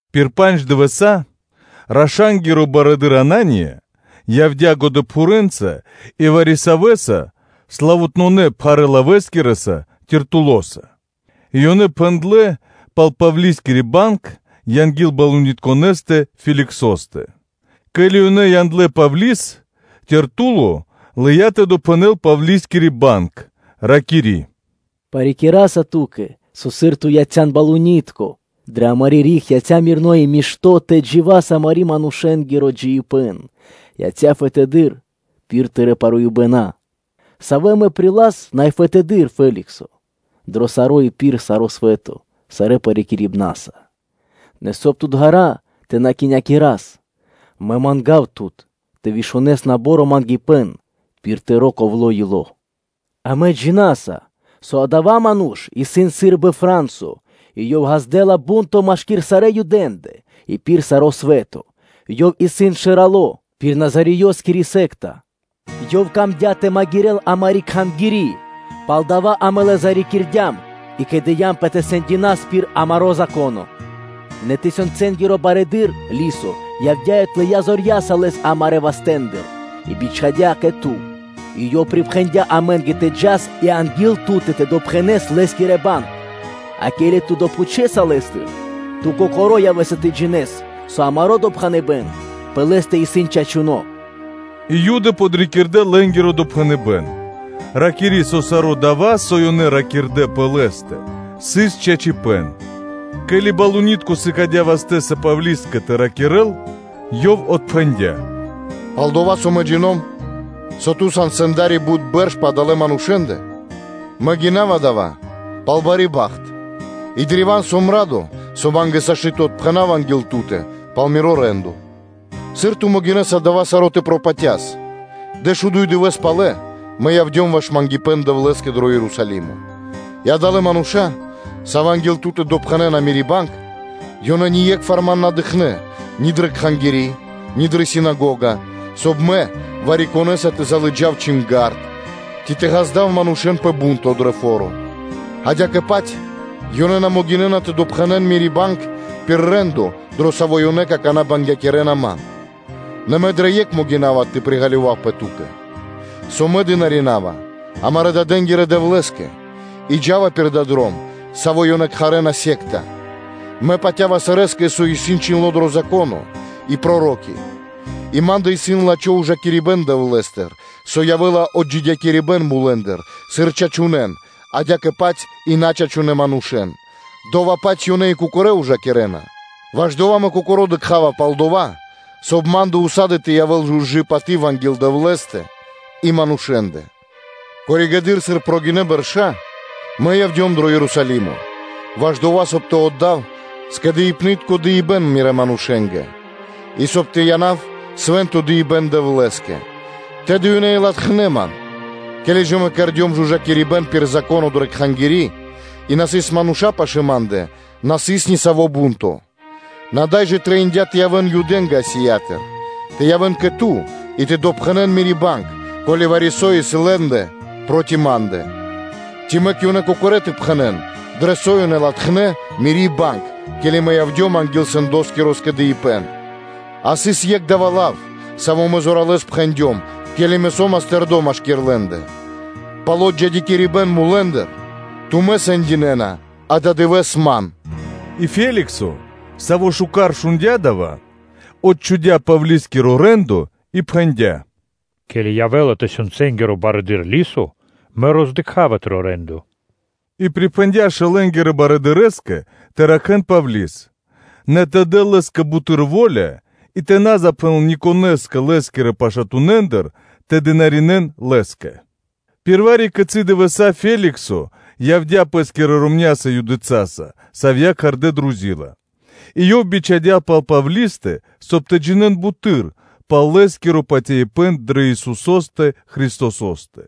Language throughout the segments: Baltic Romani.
Пир пандж дывэса́ раша́нгиро барыдыро́ Анания явдя́ годэпхурэ́нца, и вари-савэ́ славутнонэ пхарэ́-лавэ́скирэ́са (оратороса/ритороса) Тертулоса, и ёнэ пхэндлэ́ пал Павлискири банг анги́л балунитконэстэ Феликсостэ. Ке́ли ёнэ яндлэ́ Павли́с, о Тертуло лыя́ тэ допхэнэл Павлискири банг, ракири́: “Парикираса ту́кэ, со, сыр ту яця́н балунитконэса, амари́ риг яця́ раманёно́ (мирноо) и яця́ мишто́ тэ дживэ́л и амарэ́-манушэ́нгиро джиибэ́н яця́ фэдэды́р, пир тырэ́ паруибэна. Савэ амэ приласа, Най Фэдыдыр Феликсо, дро саро́ и пир саро́ свэ́то сарэ́ парикирибнаса. Нэ, соб (кай) тут ґара́ (длу́гэс) тэ на кхинякирас, мэ манга́ва Тут тэ вышунэс набаро́ мангипэ́н пир тыро́ ковло ило́. Амэ джина́са, со адава́ ману́ш исын сы́рбы фра́нсо и ёв ґаздэ́ла бу́нто машки́р сарэ́ Юдэ́ндэ и пир саро́ свэ́то, ёв исын шэрало́ пир Назареёскири секта; ёв камдя́ тэ магирэл амари́ Кхангири́, палдава́ амэ лэс зарикирдям и кэдыямпэ тэ сэндякирас пир амаро́ Зако́но; нэ тысёнцэнгиро барыдыро́ Лисо явдя́ и отлыя зорья́са лэс амарэ́ вастэ́ндыр и бичхадя́ кэ ту, и ёв припхэндя́ амэ́нгэ тэ джас и анги́л ту́тэ тэ допхэнас лэ́скири банг, а ке́ли ту допхучэса лэ́стыр, ту кокоро́ явэ́са тэ джинэ́с, со амаро́ допхэныбэ́н пэ лэ́стэ исын чачуно́” И Юды подрикирдэ лэ́нгиро допхэныбэ́н, ракири́, со саро́ дава́, со ёнэ ракирдэ́ пэ лэ́стэ, сыс чачипэ́н. Ке́ли балунитко сыкадя́ вастэ́са Павлискэ тэ ракирэ́л, ёв отпхэндя́: “Пал-дова́ со Мэ джино́м, со ту сан сэнда́ри бут бэрш пэ адалэ́ манушэ́ндэ, мэ гинава дава́ пал бари бахт и древа́н сом радо, со ма́нгэ сашты́ тэ отпхэнав анги́л ту́тэ пал миро рэ́ндо (де́ло). Сыр ту могинэ́са дава́ саро́ тэ пропатяс, дэшуду́й дывэса́ палэ мэ явдём ваш мангипэ́н Дэвлэ́скэ дро Ерусалимо, и адалэ́ мануша́, савэ́ анги́л ту́тэ допхэнэна мири́ банг, ёнэ ние́кхвар ман на дыкхнэ́ ни дрэ Кхангири́ ни дрэ синагога, соб (кай) мэ вари-конэса тэ лыджав чинга́рд, ци тэ ґаздав манушэ́н пэ бу́нто дро фо́ро, адя́кэ-паць ёнэ на могинэ́на тэ допхэнэн мири́ банг пир рэ́ндо, дро саво́ ёнэ какана́ бангякирэна ман. Нэ мэ дрэ екх могина́ва тэ приґалёвавпэ ту́кэ, со мэ дынаринава амарэ́-дадэнги́рэ Дэвлэ́скэ и джа́ва пир дава́ Дром, саво́ ёнэ кхарэ́на “ересь (секта),” мэ патя́ва сарэскэ, со исын чхиндло́ дро Зако́но и Проро́ки; и ма́ндэ исын лачхо́ ужакирибэ́н Дэвлэ́стыр, со явэ́ла отджидякирибэн мулэ́ндыр, сыр чачунэн, адя́кэ-паць и начачунэ манушэ́н, дова́-паць ёнэ и кокорэ́ ужакирэ́на. Ваш дава́ мэ кокоро́ дыкха́ва пал дова́, соб (кай) ма́ндэ ўса́ды (сак) тэ явэ́л жужы паты́в анги́л Дэвлэ́стэ и манушэ́ндэ. Коригэды́р (позжэ), сыр гинэ́ бэрша́, мэ явдём дро Ерусалимо, ваш дова́, соб (кай) тэ отдав скэдыибнытко дыибэ́н мирэ́ манушэ́нгэ, и соб (кай) тэ янав свэ́нто дыибэ́н Дэвлэ́скэ; тэды ёнэ и латхнэ́ ман, ке́ли мэ кэрдём жужакирибэн пир Зако́но дрэ Кхангири́, и на сыс мануша́ пашы́л ма́ндэ, на сыс ни саво́ бу́нто. Нэ ада́й жа трэиндя́ тэ явэ́н Юдэ́нгэ Асиятыр, тэ явэ́н кэ ту и тэ допхэнэн мири́ банг, ко́ли вари-со исын лэ́ндэ проти ма́ндэ; ци мэк ёнэ кокорэ́ тэ пхэнэ́н, дрэ со ёнэ латхнэ́ мири́ банг, ке́ли мэ явдём анги́л сэндоскиро скэдыибэ́н, а сыс екх дава́ лав, саво́ мэ зоралэ́с пхэндём, ке́ли мэ со́мас тэрдо́ машки́р лэ́ндэ: “Пал отджидякирибэн мулэ́ндыр тумэ́ сэндинэна ададывэ́с ман!” И Феликсо, саво́ миштэ́с джиндя́ дава́ Дром, отчхудя Павли́скиро рэ́ндо и пхэндя́: “Ке́ли явэ́ла тысёнцэнгиро барыдыро́ Лисо, мэ роздыкхава тыро́ рэ́ндо”; и припхэндя́ шэлэнгирэ барыдырэ́скэ тэ ракхэ́н Павли́с, нэ тэ дэл лэ́скэ буты́р во́ля, и тэ на запхэнэл никонэ́скэ лэ́скирэ пашатунэндыр тэ дынаринэ́н лэ́скэ. Пир вари-кицы́ дывэса́ Феликсо явдя́ пэ́скирэ ромня́са Юдыцаса, савья́ кхардэ́ Друзила, и ёв бичхадя́ пал Павлистэ, соб (кай) тэ джинэ́н буты́р пал лэ́скиро патяибэ́н дрэ Исусо́стэ Христосо́стэ.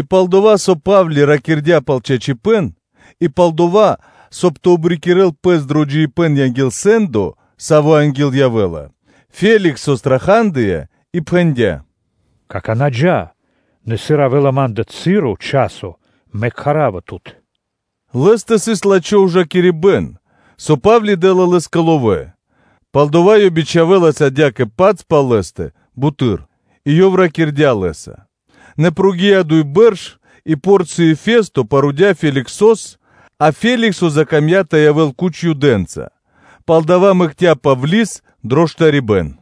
И пал-дова́ со Па́вли ракирдя́ пал чачипэ́н, и пал-дова́, соб (кай) тэ обрикирэл пэс дро джиибэ́н анги́л сэ́ндо, саво́ анги́л явэ́ла, о Феликсо страхадыя и пхэндя́: “Какана́ джа́, нэ сыр явэ́ла ма́ндэ часо, мэ кхара́ва тут”; лэ́стэ сыс лачхо́ ужакирибэ́н, со Па́вли дэ́ла лэ́скэ ловэ́: пал-дова́ ёв бичхавэлас адя́кэ-паць пал лэ́стэ буты́р и ёв ракирдя́ лэ́са. Нэ прогинэ́ (накхлэ) дуй бэрша́, и Порцыё Фесто парудя Феликсос, а Феликсо закамдя́ тэ явэ́л куч Юдэнца, палдава́ мэкця́ Павли́с дро штарибэ́н.